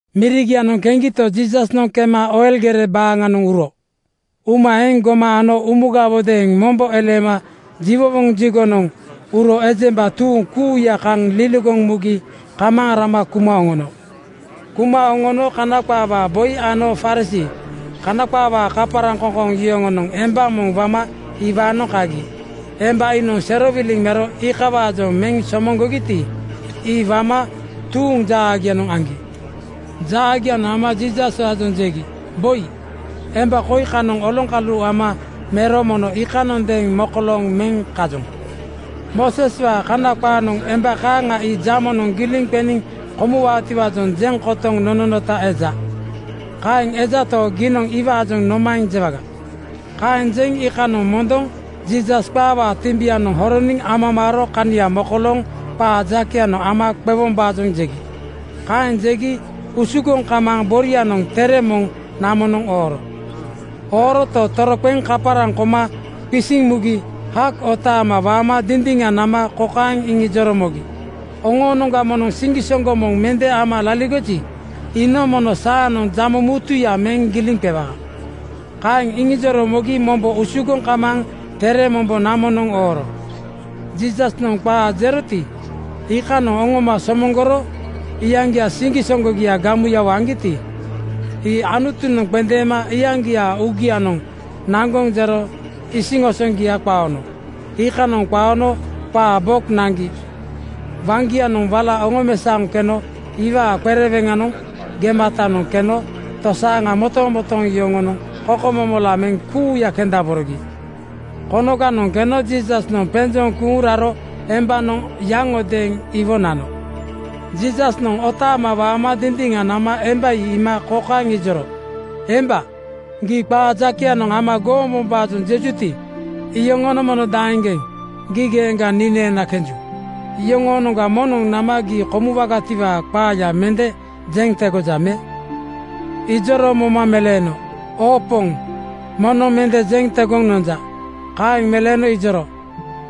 Mirigianoŋ keŋgito, Jiisasnoŋ kema Oil gere baaŋanoŋ uro. Uma eŋ gomaŋ ano umugawodeeŋ mombo eleema jiwowoŋ jigonoŋ uro ejemba tuuŋ kuuya kaŋ liligoŋ mugi kamaaŋ rama kuma oŋono. Kuma oŋono Kana qaawaa boi ano Farisii (Kana qaawaa kaparaŋkoŋkoŋ) yoŋonoŋ emba moŋ wama iwaanoŋ kagi. Emba iinoŋ serowiliŋ mero iikawaajoŋ meŋ somoŋgogiti, ii wama tuuŋ jaagianoŋ aŋgi. Jaagianoŋ ama Jiisaswaajoŋ jegi, “Boi, emba koi kanoŋ oloŋkalu ama mero mono iikanondeeŋ mokolooŋ meŋ kajoŋ. Mooseswaa Kana qaanoŋ emba kaaŋa ii jamonoŋ giliŋ qeniŋ komuwaatiwaajoŋ jeŋ kotoŋ nononota eja. Kaeŋ ejato, giinoŋ iwaajoŋ nomaeŋ jewaga?” Kaeŋ jeŋ iikanoŋ mondoŋ Jiisas qaawaa timbinoŋ horoniŋ amamaaro kania mokolooŋ qaa jakeyanoŋ ama qewombaajoŋ jegi. Kaeŋ jegi usugoŋ kamaaŋ borianoŋ tere moŋ namonoŋ ooro. Ooroto, toroqeŋ kaparaŋ koma qisiŋ mugi hak otaama waama dindiŋa nama kokaeŋ iŋijoro mogi, “Oŋoonoŋga moŋnoŋ siŋgisoŋgo moŋ mende ama laligoji, iinoŋ mono saanoŋ jamo mutuya meŋ giliŋ qewaa.” Kaeŋ iŋijoro mogi mombo usugoŋ kamaaŋ tere mombo namonoŋ ooro. Jiisasnoŋ qaa jeroti, iikanoŋ oŋoma somoŋgoro iyaŋgia siŋgisoŋgogia gamuyawo aŋgiti, ii Anutunoŋ qendeema iyaŋgiaa uugianoŋ naŋgoŋ jero isiŋosoŋgia qaono. Iikanoŋ qaono qaa bok naŋgi waŋgianoŋ wala oŋomesaoŋ keno iwaa qereweŋanoŋ gematanoŋ keno tosaaŋa motomotooŋ yoŋonoŋ kokomomola meŋ kuuya kendaborogi. Konoganoŋ keno Jiisasnoŋ penjoŋ kuuŋ raro embanoŋ yaŋodeeŋ iwo nano. Jiisasnoŋ otaama waama dindiŋa nama emba ii iima kokaeŋ ijoro, “Emba, gii qaa jakeyanoŋ ama gombombaajoŋ jejuti, iyoŋonoŋ mono daeŋgeŋ gii geeŋga nii neena kenju? Yoŋoonoŋga moŋnoŋ nama gii komuwagatiwaa qaaya mende jeŋ tegoja me?” Ijoro moma meleeno, “Oo Poŋ, moŋnoŋ mende jeŋ tegoŋ nonja.” Kaeŋ meleeno ijoro,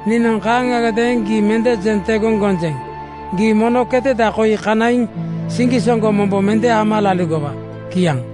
“Niinoŋ kaaŋagadeeŋ gii mende jeŋ tegoŋ gonjeŋ. Gii mono keteda koi kanaiŋ siŋgisoŋgo mombo mende ama laligowa.” Kiaŋ.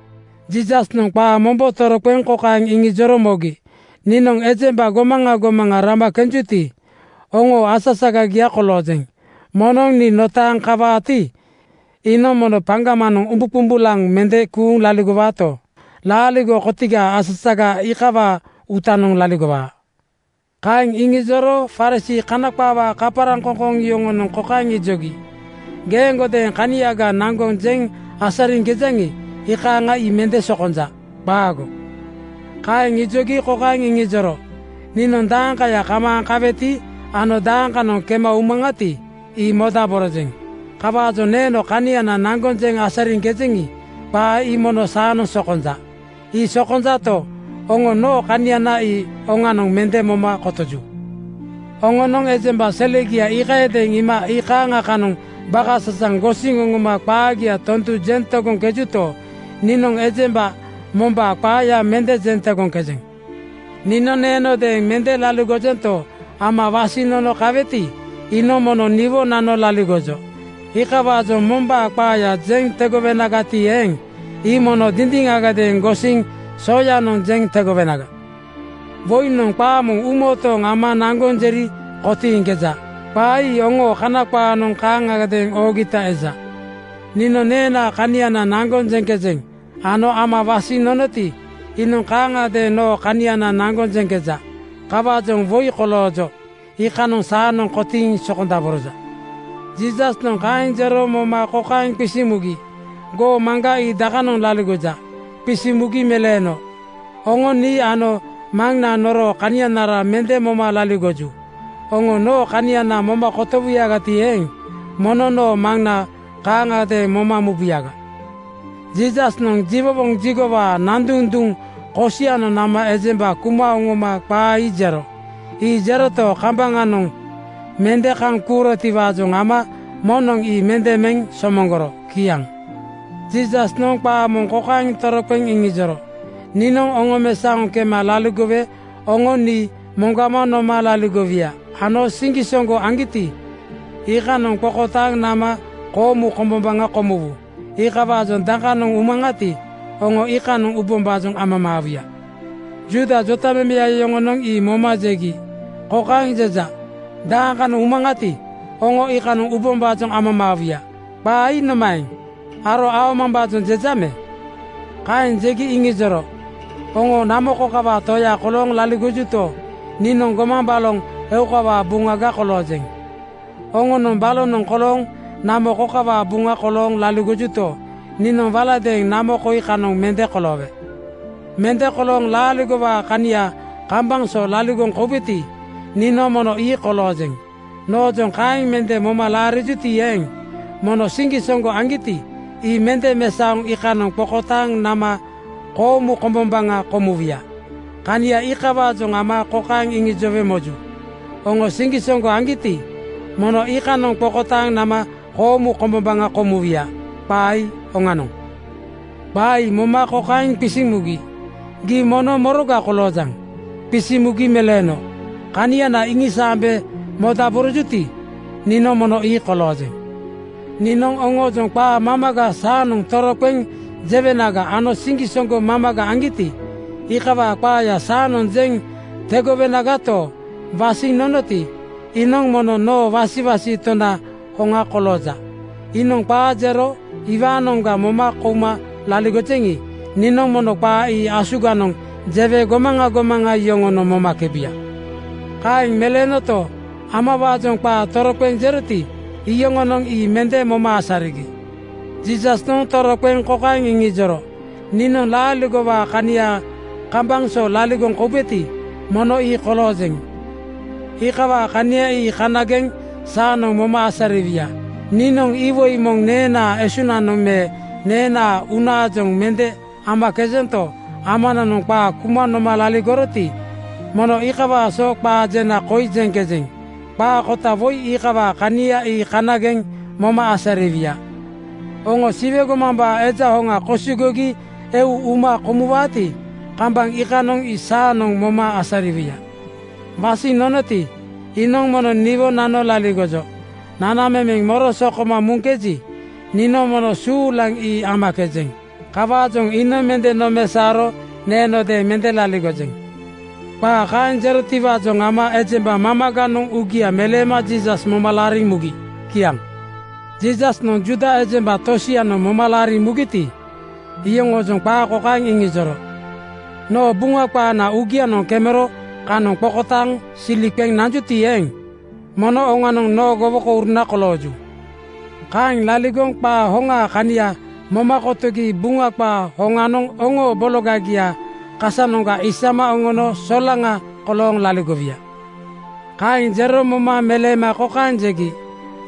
Jiisasnoŋ qaa mombo toroqeŋ kokaeŋ iŋijoro mogi, “Niinoŋ ejemba gomaŋa gomaŋa rama kenjuti, oŋoo asasagagia koloojeŋ. Moŋnoŋ nii notaaŋ kawaati, iinoŋ mono paŋgamanoŋ umbuqumbulaŋ mende kuuŋ laligowaato, laaligo kotigaa asasaga iikawaa uutanoŋ laligowaa.” Kaeŋ iŋijoro Farisii (Kana qaawaa kaparaŋkoŋkoŋ) yoŋonoŋ kokaeŋ ijogi, “Geeŋgodeeŋ kaniaga naŋgoŋ jeŋ asariŋkejaŋi, iikaaŋa ii mende sokonja. Qaago.” Kaeŋ ijogi kokaeŋ iŋijoro, “Niinoŋ daakaya kamaaŋ kaweti ano dakanoŋ kema umaŋati, ii modaborojeŋ. Kawaajoŋ neeno kaniana naŋgoŋ jeŋ asariŋkejeŋi, qaa ii mono saanoŋ sokonja. Ii sokonjato, oŋo noo kaniana ii oŋanoŋ mende moma kotoju. Oŋonoŋ ejemba selegia iikayadeeŋ iima iikaaŋa kanoŋ bakasasaŋ gosiŋ oŋoma qaagia tondu jeŋ tegoŋkejuto, niinoŋ ejemba mombaa qaaya mende jeŋ tegoŋkejeŋ. “Nii neenodeeŋ mende laligojento, Ama wasiŋ nono kaweti, iinoŋ mono niwo nano laligojo. Iikawaajoŋ mombaa qaaya jeŋ tegowenagati eeŋ, ii mono dindiŋagadeeŋ gosiŋ soyanoŋ jeŋ tegowenaga. Woinoŋ qaa moŋ uumotooŋ ama naŋgoŋ jeri kotiiŋkeja. Qaa ii oŋoo Kana qaanoŋ kaaŋagadeeŋ oogita eja. “Niinoŋ neenaa kaniana naŋgoŋ jeŋkejeŋ ano Ama wasiŋ nonoti, iinoŋ kaaŋagadeeŋ noo kaniana naŋgoŋ jeŋkeja. Kawaajoŋ woi koloojo iikanoŋ saanoŋ kotiiŋ sokondaboroja.” Jiisasnoŋ kaeŋ jero moma kokaeŋ qisiŋ mugi, “Goo Maŋga ii dakanoŋ laligoja?” Qisiŋ mugi meleeno, “Oŋo nii ano Maŋna noroo kanianara mende moma laligoju. Oŋo noo kaniana moma kotowuyagati eeŋ, mono noo Maŋna kaaŋagadeeŋ moma mubuyaga.” Jiisasnoŋ jiwowoŋ jigowaa nanduŋ duŋ kosianoŋ nama ejemba kuma oŋoma qaa ii jero. Ii jeroto, kambaŋanoŋ mende kaŋ kuurotiwaajoŋ ama moŋnoŋ ii mende meŋ somoŋgoro. Kiaŋ. Jiisasnoŋ qaa moŋ kokaeŋ toroqeŋ iŋijoro, “Niinoŋ oŋomesaoŋ kema laligowe oŋo nii moŋgama noma laligowuya ano siŋgisoŋgo aŋgiti, iikanoŋ qokotaaŋ nama koomu kombombaŋa komuwu. Iikawaajoŋ dakanoŋ umaŋati, oŋo iikanoŋ ubombaajoŋ amamaawuya.” Juuda jotamemeya yoŋonoŋ ii moma jegi, “Kokaeŋ jeja, ‘Dakanoŋ umaŋati, oŋo iikanoŋ ubombaajoŋ amamaawuya.’ Qaa ii nomaeŋ? Aro aomambaajoŋ jeja me?” Kaeŋ jegi iŋijoro, “Oŋo namo kokawaa toya kolooŋ laligojuto, niinoŋ gomaŋ baloŋ eukawaa buŋaga koloojeŋ. Oŋonoŋ balonoŋ kolooŋ namo kokawaa buŋa kolooŋ laligojuto, niinoŋ waladeeŋ namo koi kanoŋ mende koloowe. Mende kolooŋ laaligowaa kania kambaŋ so laligoŋ koubeti, niinoŋ mono ii koloojeŋ. Noojoŋ kaeŋ mende moma laarijuti eeŋ, mono siŋgisoŋgo aŋgiti, ii mende mesaoŋ iikanoŋ qokotaaŋ nama koomu kombombaŋa komuwuya. Kania iikawaajoŋ ama kokaeŋ iŋijowe moju, ‘Oŋo siŋgisoŋgo aŋgiti, mono iikanoŋ qokotaaŋ nama koomu kombombaŋa komuwuya’. Qaa ii oŋanoŋ.” Qaa ii moma kokaeŋ qisiŋ mugi, “Gii mono moroga koloojaŋ?” Qisiŋ mugi meleeno, “Kaniana iŋisaambe modaborojuti, niinoŋ mono ii koloojeŋ. Niinoŋ oŋoojoŋ qaa mamaga saanoŋ toroqeŋ jewenaga ano siŋgisoŋgo mamaga aŋgiti, iikawaa qaaya saanoŋ jeŋ tegowenagato, wasiŋ nonoti, iinoŋ mono noo wasiwasi Tona hoŋa kolooja. Iinoŋ qaa jero iwaanoŋga moma kouma laligojeŋi, niinoŋ mono qaa ii asuganoŋ jewe gomaŋa gomaŋa yoŋonoŋ momakebuya.” Kaeŋ meleenoto, Amawaajoŋ qaa toroqeŋ jeroti, iyoŋonoŋ ii mende moma asarigi. Jiisasnoŋ toroqeŋ kokaeŋ iŋijoro, “Niinoŋ laaligowaa kania kambaŋ so laligoŋ koubeti, mono ii koloojeŋ. Iikawaa kania ii kanageŋ saanoŋ moma asariwuya. Niinoŋ iwoi moŋ neenaa esunanoŋ me neenaa uunaajoŋ mende amakejento, Amananoŋ qaa kuma noma laligoroti, mono iikawaa so qaa jena koi jeŋkejeŋ. Qaa kota woi iikawaa kania ii kanageŋ moma asariwuya. Oŋo Siwe gomambaa Eja Hoŋa kosigogi eu uma komuwaati, kambaŋ iikanoŋ ii saanoŋ moma asariwuya. Wasiŋ nonoti, iinoŋ mono niwo nano laligojo. Nanamemeŋ moro sokoma muŋkeji, niinoŋ mono suulaŋ ii amakejeŋ. Kawaajoŋ iinoŋ mende nomesaoro neenodeeŋ mende laligojeŋ.” Qaa kaeŋ jerotiwaajoŋ ama ejemba mamaganoŋ uugia meleema Jiisas moma laariŋ mugi. Kiaŋ. Jiisasnoŋ Juuda ejemba tosianoŋ moma laariŋ mugiti, iyoŋoojoŋ qaa kokaeŋ iŋijoro, “Noo Buŋa qaananoŋ uugianoŋ kemero kanoŋ qokotaaŋ silia qeŋ nanjuti eeŋ, mono oŋanoŋ noo gowokouruna kolooju. Kaeŋ laligoŋ qaa hoŋaa kania moma kotogi Buŋa qaa hoŋanoŋ oŋo bologagiaa kasanoŋga isama oŋono solaŋa (frii) kolooŋ laligowuya.” Kaeŋ jero moma meleema kokaeŋ jegi,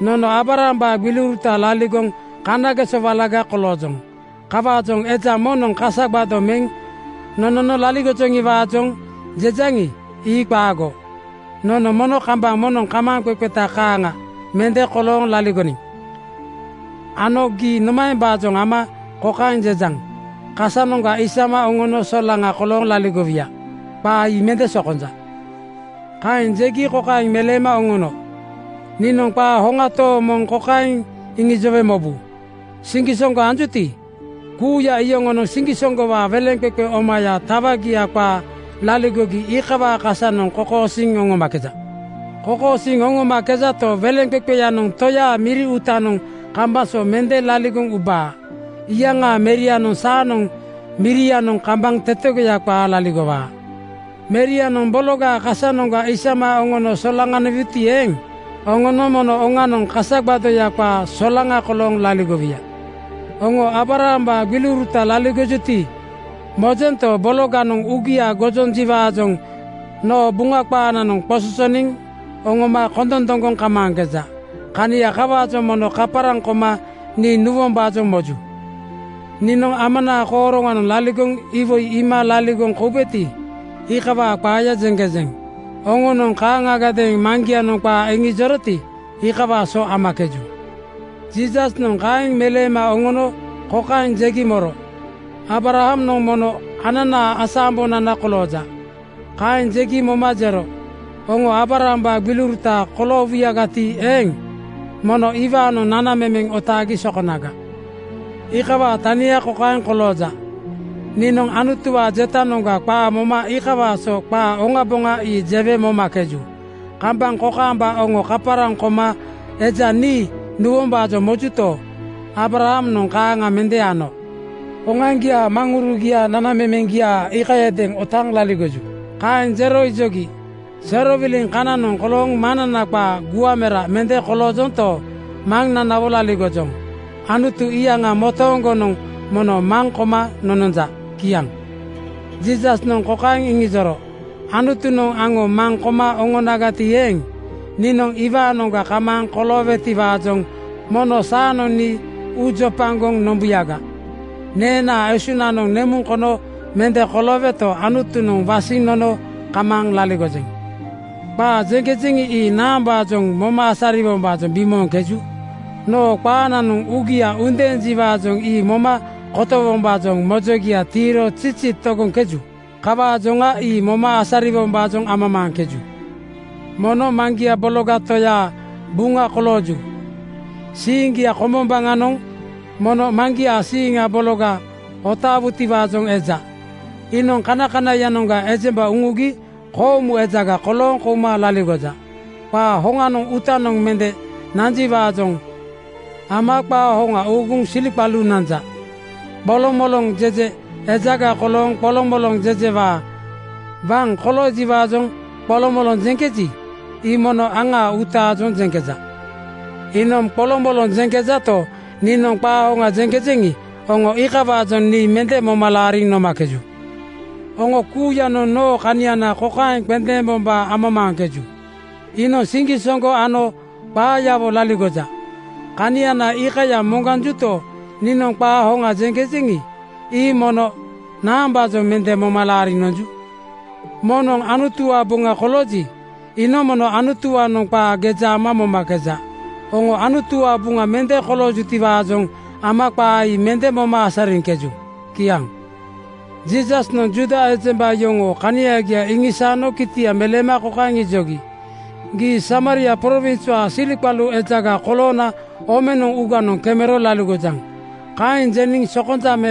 “Nono Aabrahambaa gbiliuruta laligoŋ kanageso walaga koloojoŋ. Kawaajoŋa eja moŋnoŋ kasa gbado meŋ nonono laligojoŋiwaajoŋ jejaŋi, ii qaago. Nono mono kambaŋ moŋnoŋ kamaaŋqeqeta kaaŋa mende kolooŋ laligoniŋ. Ano gii nomaembaajoŋ ama kokaeŋ jejaŋ, ‘Kasanoŋga isama oŋono solaŋa kolooŋ laligowuya’? Qaa ii mende sokonja.” Kaeŋ jegi kokaeŋ meleema oŋono, “Niinoŋ qaa hoŋa tooŋ moŋ kokaeŋ iŋijowe mobu: Siŋgisoŋgo anjuti, kuuya iyoŋonoŋ siŋgisoŋgowaa weleŋqeqe omaya tawagia qaa laligogi iikawaa kasanoŋ kokosiiŋ oŋomakeja. Kokosiiŋ oŋomakejato, weleŋqeqenoŋ toyaa miri uutanoŋ kambaŋ so mende laligoŋ ubaa. Iyaŋaa Merianoŋ saanoŋ mirianoŋ kambaŋ tetegoya qaa laligowaa. “Merianoŋ bologaa kasanoŋga isama oŋono solaŋaniwuti eeŋ, oŋonoŋ mono oŋanoŋ kasa gbadoya qaa solaŋa (frii) kolooŋ laligowuya. Oŋo Aabrahambaa gbiliuruta laligojuti, mojento, bologanoŋ uugia gojonjiwaajoŋ noo Buŋa qaananoŋ qososoniŋ oŋoma kondondoŋgoŋ kamaaŋkeja. Kania kawaajoŋ mono kaparaŋ koma nii nuwombaajoŋ moju. Niinoŋ Amanaa kooroŋanoŋ laligoŋ iwoi iima laligoŋ koubeti, iikawaa qaayaga jeŋkejeŋ. Oŋonoŋ kaaŋagadeeŋ maŋgianoŋ qaa iŋijoroti, iikawaa so amakeju.” Jiisasnoŋ kaeŋ meleema oŋono kokaeŋ jegi moro, “Aabrahamnoŋ mono ananaa asa-ambonana kolooja.” Kaeŋ jegi moma jero, “Oŋo Aabrahambaa gbiliuruta koloowuyagati eeŋ, mono iwaanoŋ nanamemeŋ otaagi sokonaga. Iikawaa tania kokaeŋ kolooja: Niinoŋ Anutuwaa jetanoŋga qaa moma iikawaa so qaa oŋaboŋa ii jewe momakeju. Kambaŋ kokaamba oŋo kaparaŋ koma eja nii nuwombaajoŋ mojuto, Aabrahamnoŋ kaaŋa mende ano. Oŋoaŋgiaa maŋurugiaa nanamemeŋgia iikayadeeŋ otaaŋ laligoju.” Kaeŋ jero ijogi, “Serowiliŋ kananoŋ kolooŋ maŋnana qaa (gua mera) mende koloojonto, Maŋnanawo laligojoŋ. Anutu iyaŋa motooŋgonoŋ mono maŋ koma nononja.” Kiaŋ. Jiisasnoŋ kokaeŋ iŋijoro, “Anutunoŋ aŋo maŋ koma oŋonagati eeŋ, niinoŋ iwaanoŋga kamaaŋ koloowetiwaajoŋ mono saanoŋ nii uu jopagoŋ nombuyaga. Neenaa esuŋnoŋ nemuŋ kono mende kolooweto, Anutunoŋ wasiŋ nono kamaaŋ laligojeŋ. Qaa jeŋkejeŋi, ii naambaajoŋ moma asariwombaajoŋ bimooŋkeju? Noo qaananoŋ uugia undeenjiwaajoŋ ii moma kotowombaajoŋ mojogia tiiro zizi togoŋkeju. Kawaajoŋa ii moma asariwombaajoŋ amamaaŋkeju? “Mono maŋgia Bologa Toyaa buŋa kolooju. Siiŋgia kombombaŋanoŋ mono maŋgiaa siiŋa bologa otaawutiwaajoŋ eja. Iinoŋ kanakanaiyanoŋga ejemba uŋugi koomu ejaga kolooŋ kouma laligoja. Qaa hoŋanoŋ uutanoŋ mende nanjiwaajoŋ ama qaa hoŋa uuguŋ siliqalu nanja. Qolomoloŋ jeje ejaga kolooŋ qolomoloŋ jejewaa waŋ koloojiwaajoŋ qolomoloŋ jeŋkeji, ii mono aŋaa uutaajoŋ jeŋkeja. “Iinoŋ qolomoloŋ jeŋkejato, niinoŋ qaa hoŋa jeŋkejeŋi, oŋo iikawaajoŋ nii mende moma laariŋ nomakeju. Oŋo kuuyanoŋ noo kaniana kokaeŋ qendeembombaa amamaaŋkeju: Iinoŋ siŋgisoŋgo ano qaayawo laligoja. Kaniana iikaya moŋganjuto, niinoŋ qaa hoŋa jeŋkejeŋi, ii mono naambaajoŋ mende moma laariŋ nonju? “Moŋnoŋ Anutuwaa buŋa kolooji, iinoŋ mono Anutuwaanoŋ qaa geja ama momakeja. Oŋo Anutuwaa buŋa mende koloojutiwaajoŋ ama qaa ii mende moma asariŋkeju.” Kiaŋ. Jiisasnoŋ Juuda ejemba yoŋoo kanagia iŋisaano kitia meleema kokaeŋ ijogi, “Gii Samaria prowinswaa siliqalu ejaga koloona omenoŋ uuganoŋ kemero laligojaŋ. Kaeŋ jeniŋ sokonja me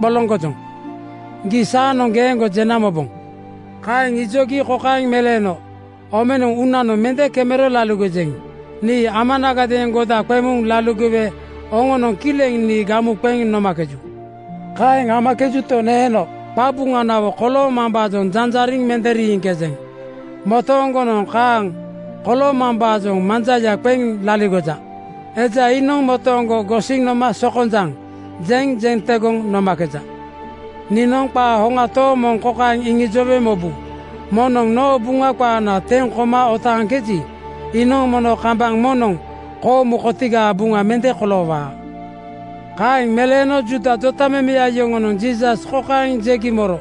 qoloŋgojoŋ, ii saanoŋ geeŋgo jena moboŋ.” Kaeŋ ijogi kokaeŋ meleeno, “Omenoŋ uunanoŋ mende kemero laligojeŋ. Nii Amanagadeeŋ goda qeŋ muŋ laligowe oŋonoŋ kileŋ nii gamu qeŋ nomakeju. Kaeŋ amakejuto, neeno qabuŋanawo koloomambaajoŋ janjariŋ mende riiŋkejeŋ. Motooŋgonoŋ kaaŋ koloomambaajoŋ manjaya qeŋ laligoja. Eja iinoŋ motooŋgo gosiŋ noma ‘sokonjaŋ,’ jeŋ jeŋ tegoŋ nomakeja. Niinoŋ qaa hoŋa tooŋ moŋ kokaeŋ iŋijowe mobu: Moŋnoŋ noo Buŋa qaana teŋ koma otaaŋkeji, iinoŋ mono kambaŋ moŋnoŋ koomu kotigaa buŋa mende koloowaa.” Kaeŋ meleeno Juuda jotamemeya yoŋonoŋ Jiisas kokaeŋ jegi moro,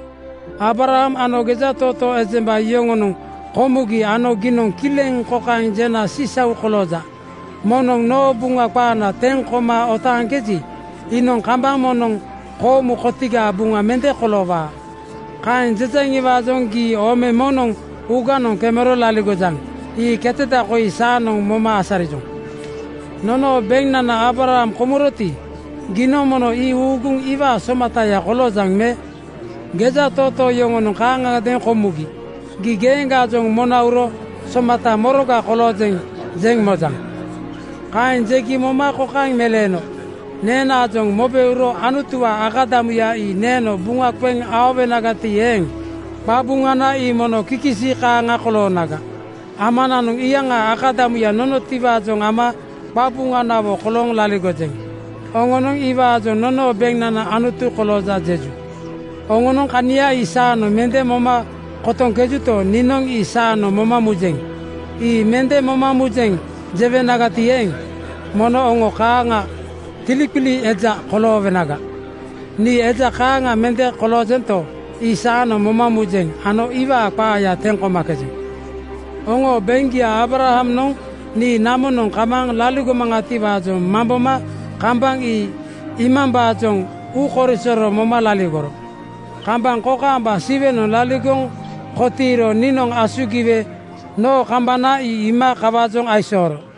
“Aabraham ano gejatootoo ejemba yoŋonoŋ komugi ano giinoŋ kileŋ kokaeŋ jena sisau kolooja, ‘Moŋnoŋ noo Buŋa qaana teŋ koma otaaŋkeji, iinoŋ kambaŋ moŋnoŋ koomu kotigaa buŋa mende koloowaa.’ Kaeŋ jejaŋiwaajoŋ gii ome moŋnoŋ uuganoŋ kemero laligojaŋ. Ii keteda koi saanoŋ moma asarijoŋ. Nonoo beŋnana Aabraham komuroti, giinoŋ mono ii uuguŋ iwaa somataya koloojaŋ me? Gejatootoo yoŋonoŋ kaaŋagadeeŋ komugi. Gii geeŋgaajoŋ mona uro ‘Somata moroga koloojeŋ?’ jeŋ mojaŋ?” Kaeŋ jegi moma kokaeŋ meleeno, “Neenaajoŋ mobe uro Anutuwaa akadamuya ii neeno buŋa qeŋ aowenagati eeŋ, qabuŋana ii mono kikisi kaaŋa koloonaga. Amananoŋ iyaŋaa akadamuya nonotiwaajoŋ ama qabuŋanawo kolooŋ laligojeŋ. Oŋonoŋ iwaajoŋ ‘Nonoo beŋnana Anutu kolooja,’ jeju. Oŋonoŋ kania ii saanoŋ mende moma kotoŋkejuto, niinoŋ ii saanoŋ moma mujeŋ. ‘Ii mende moma mujeŋ,’ jewenagati eeŋ, mono oŋo kaaŋa tiliqili eja koloowenaga. Nii eja kaaŋa mende koloojento, ii saanoŋ moma mujeŋ ano iwaa qaaya teŋ komakejeŋ. Oŋoo beŋgia Aabrahamnoŋ nii namonoŋ kamaaŋ laligomaŋatiwaajoŋ mamboma kambaŋ ii iimambaajoŋ uu korisoro moma laligoro. Kambaŋ kokaamba Siwenoŋ laligoŋ kotiiro niinoŋ asugiwe noo kambana ii iima kawaajoŋ aisooro.”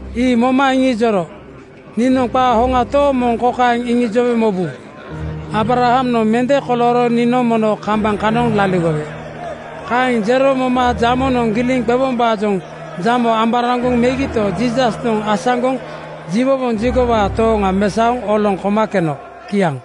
Ii moma iŋijoro, “Niinoŋ qaa hoŋa tooŋ moŋ kokaeŋ iŋijowe mobu: Aabrahamnoŋ mende kolooro niinoŋ mono kambaŋ kanoŋ laligowe.” Kaeŋ jero moma jamonoŋ giliŋ qewombaajoŋ jamo amboraŋgoŋ megito, Jiisasnoŋ asaŋgoŋ jiwowoŋ jigowaa tooŋa mesaoŋ oloŋ koma keno. Kiaŋ.